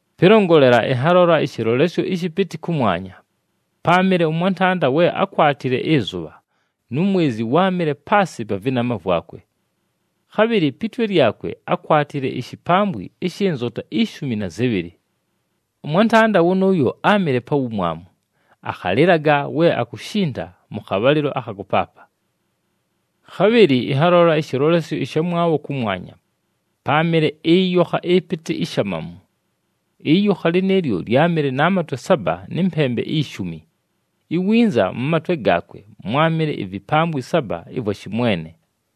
Pɨlongolela, ɨnhalola ɨshɨlolesyo ɨshɨpɨtɨ kʉmwanya: páamɨle ʉmwantanda we akwatile ɨzʉbha, nu mwezi wáamɨle paasɨ pa vɨnama vwakwe. Khabhɨlɨ pi twe lyakwe ákwatile ishipambwi ɨshɨ nzota ishumi na zɨbhɨlɨ. Ʉmwantanda wʉnʉʉyo áamɨle pa wumwamu, akhalɨlaga we akushinta mʉ khabhalɨlo akha kʉpaapa. Khabhɨlɨ ɨnhalola ɨshɨlolesyo ɨshamwabho kʉmwanya: páamɨle ɨyokha ɨpɨtɨ ishamamu. Ɨyokha lɨnɨɨlyo lyámɨle na matwe saba nɨ mpembe ishumi, iwinza mʉ matwe gaakwe mwámɨle ivipambwi saba ɨvwa shɨmwene.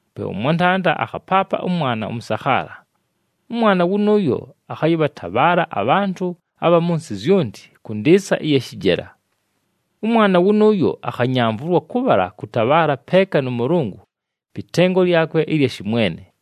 Pe ʉmwantanda akhapaapa ʉmwana ʉmʉsakhaala. Ʉmwana wʉnʉʉyo “akhayɨbhatabhaala abhantʉ abha mʉ nsɨ zyonti kʉ ndɨɨsa ɨya shɨjela.” Ʉmwana wʉnʉʉyo akhanyamvʉlwa kʉbhala kʉtabhaala peeka nʉ Mʉlʉngʉ pɨ tengo lyakwe ɨlya shɨmwene.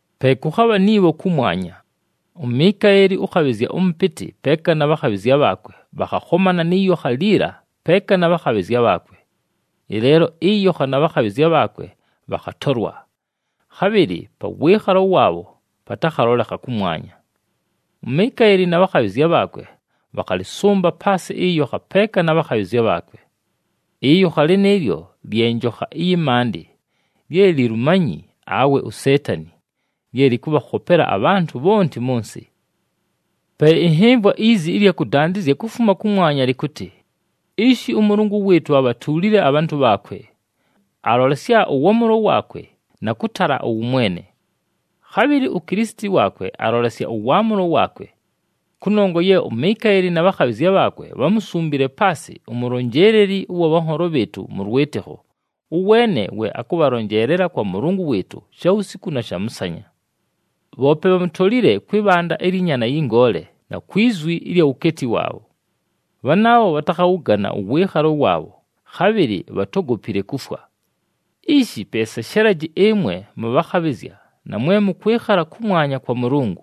Pe kʉkhabha ni bho kʉmwanya. UMikaeli ʉkhabhɨzya ʉmʉpɨtɨ peeka na bhakhabhɨzya bhaakwe bhakhakhomana nɨ yokha liila peeka na bhakhabhɨzya bhaakwe. Ɨleelo ɨyokha na bhakhabhɨzya bhaakwe bhakhatolwa, khabhɨlɨ pa wɨɨkhalo waabho patakhalolekha kʉmwanya. UMikaeli na bhakhabhɨzya bhaakwe bhakhalɨsʉmba paasɨ ɨyokha peeka na bhakhabhɨzya bhaakwe. Ɨyokha lɨnɨɨlyo lye njokha ɨyɨ maandɨ, lye Lilumanyi awe uSeetani, lye lɨkʉbhakhopela abhantʉ bhonti mʉ nsɨ. Pe ɨnhɨmvwa izi ɨlya kʉdandɨzya kufuma kʉmwanya lɨkʉtɨ, “Ishi, ʉMʉlʉngʉ wɨɨtʉ abhatuulile abhantʉ bhaakwe! Alolesya ʉwaamʉlo waakwe na kʉtala ʉwʉmwene! Khabhɨlɨ uKilisiti waakwe alolesya ʉwaamʉlo waakwe! Kʉnongwa ye uMikaeli na bhakhabhɨzya bhaakwe bhámusumbile paasɨ umulonjeeleli ʉwa bhanholo bhɨɨtʉ mʉ lwɨtɨkho, ʉweene we akʉbhalonjeelela kwa Mʉlʉngʉ wɨɨtʉ, shawusiku na shamʉsanya. Bhoope bhamutolile kwɨ bhanda ɨlyɨ Nyaana yɨ Ngoole, na kwi zwi ɨlya wukeeti waabho. Bhanaabho bhatakhawʉgana ʉwɨɨkhalo waabho, khabhɨlɨ bhatógopile kufwa. Ishi pe seshelaji, ɨmwe mʉbhakhabhɨzya, na mwe mʉkwɨkhala kʉmwanya kwa Mʉlʉngʉ!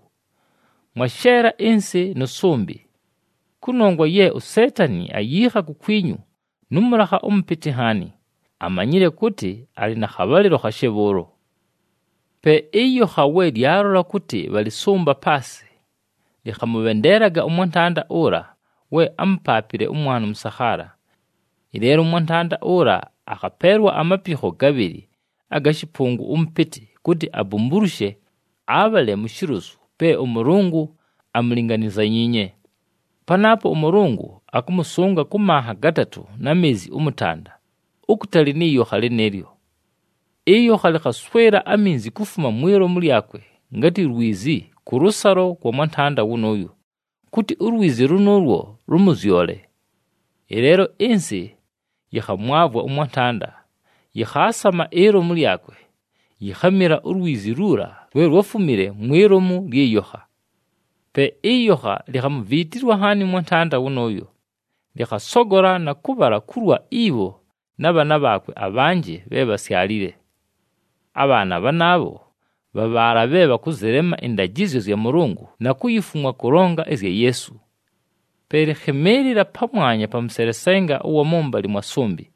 Mwasheela ɨnsɨ nʉ sʉmbɨ! Kʉnongwa ye uSeetani ayiikha kukwinyu nʉ mʉlakha ʉmʉpɨtɨ nhaani, amanyile kʉtɨ alɨ na khabhalɨlo khashe bhʉʉlo.” Pe ɨyokha we lyalola kʉtɨ bhalɨsʉmba paasɨ, lɨkhamʉbhendeelaga ʉmwantanda ʉla we ámupaapile ʉmwana ʉmʉsakhaala. Ɨleelo ʉmwantanda ʉla akhapeelwa amapikho gabhɨlɨ aga shɨpʉngʉ ʉmʉpɨtɨ, kʉtɨ abumbulushe, abhale mu shilozu pe ʉMʉlʉngʉ amulinganyizanyiinye. Panaapo ʉMʉlʉngʉ akʉmʉsʉnga kʉ manha gatatʉ na meezi ʉmʉtanda, ukutali nɨ yokha lɨnɨɨlyo. Ɨyokha lɨkhaswɨla aminzi kufuma mwi lomu lyakwe ngatɨ lwizi kʉlʉsalo kwa mwantanda wʉnʉʉyo, kʉtɨ ulwizi lʉnʉʉlwo lʉmʉzyole. Ɨleelo ɨnsɨ yɨkhamwavwa ʉmwantanda, yɨkhaasama ilomu lyakwe, yikhamila ulwizi luula lwe lwáfumile mwi lomu lyɨ yokha. Pe ɨyokha likhamuviitilwa nhaani ʉmwantanda wʉnʉʉyo, lɨkhasogola na kʉbhala kulwa ibho na bhaana bhaakwe abhanjɨ bhe bhásyalile. Abhaana bhanaabho bha bhaala bhe bhakʉzɨlema ɨndajɨzyo zya Mʉlʉngʉ na kuyifumwa kʉlonga ɨzya Yeesu. Pe lɨkhɨmɨɨlɨla pamwanya pa mʉselesenga ʉwa mʉmbalɨ mwa sʉmbɨ.